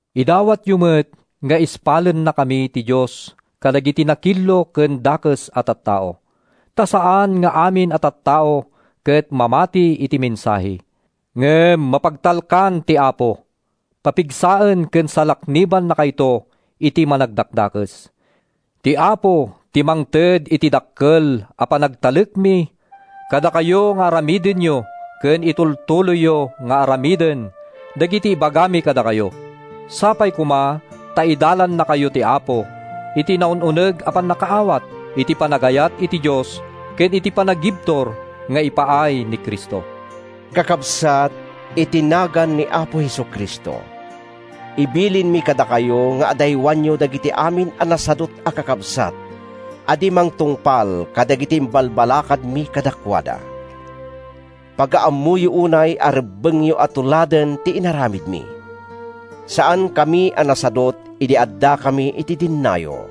Idawatyo met nga ispalennakami ti Dios kadagiti nakillo ken dakes a tattao. Ta saan nga amin a tattao ket mamati iti mensahe. Ngem mapagtalkan ti Apo. Papigsaen ken salaknibannakayto iti Managdakdakes. Ti Apo ti mangted iti dakkel a panagtalekmi kadakayo nga aramidenyo ken itultuloyyo nga aramiden dagiti ibagami kadakayo. Sapay koma ta idalannakayo ti Apo iti naun-uneg a pannakaawat iti panagayat iti Dios ken iti panagibtur nga ipaay ni Cristo. Kakabsat, iti nagan ni Apo Jesu-Cristo, ibilinmi kadakayo nga adaywanyo dagiti amin a nasadut a kakabsat a di mangtungpal kadagiti imbalbalakadmi kadakuada. Pagaammoyo unay a rebbengyo a tuladen ti inaramidmi. Saankami a nasadut idi addakami iti dennayo.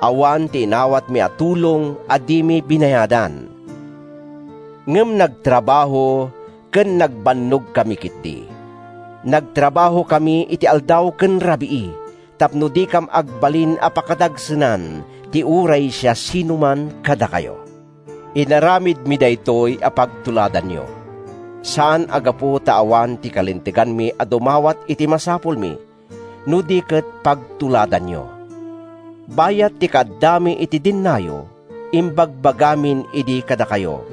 Awan ti inawatmi a tulong a dimi binayadan. Ngem nagtrabaho ken nagbannogkami ketdi. Nagtrabahokami iti aldaw ken rabii tapno dikam agbalin a pakadagsenan ti uray siasinoman kadakayo. Inaramidmi daytoy a pagtuladanyo, saan a gapu ta awan ti kalinteganmi a dumawat iti masapulmi, no di ket pagtuladanyo. Bayat ti kaaddami iti dennayo, imbagbagamin idi kadakayo,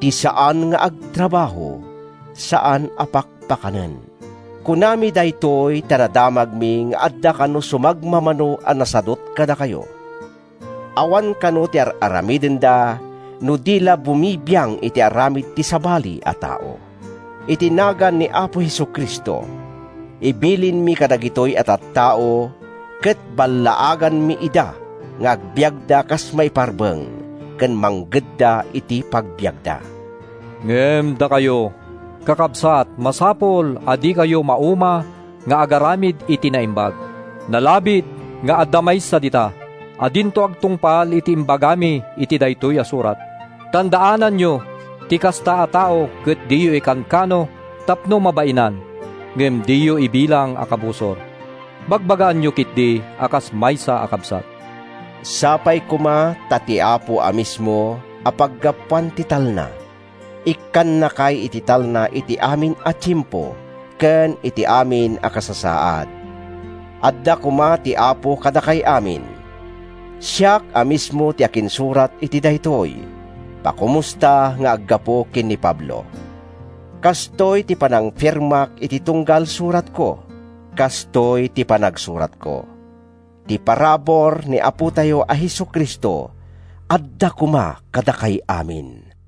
“Ti saan nga agtrabaho, saan a pakpakanen.” Kunami daytoy ta nadamagmi nga adda kano sumagmamano a nasadut kadakayo. Awan kano ti ar-aramidenda no di la bumibiang iti aramid ti sabali a tao. Iti nagan ni Apo Jesu-Cristo, ibilinmi kadagitoy a tattao ket ballaaganmi ida nga agbiagda kas maiparbeng ken manggedda iti pagbiagda. Ngem dakayo, kakabsat, masapul a dikayo mauma nga agaramid iti naimbag. Nalabit nga adda maysa dita a dinto agtungpal iti imbagami iti daytoy a surat. Tandaananyo ti kasta a tao ket diyo ikankano tapno mabainan. Ngem diyo ibilang a kabusor. Bagbagaanyo ketdi a kas maysa a kabsat. Sapay koma ta ti Apo a mismo a paggapuan ti talna, ikkannakay iti talna iti amin a tiempo ken iti amin a kasasaad. Adda koma ti Apo kadakay amin. Siak a mismo ti akinsurat iti daytoy: Pakomusta nga aggapu ken ni Pablo. Kastoy ti panangfirmak iti tunggal suratko. Kastoy ti panagsuratko. Ti parabur ni Apotayo a Jesu-Cristo adda koma kadakay amin.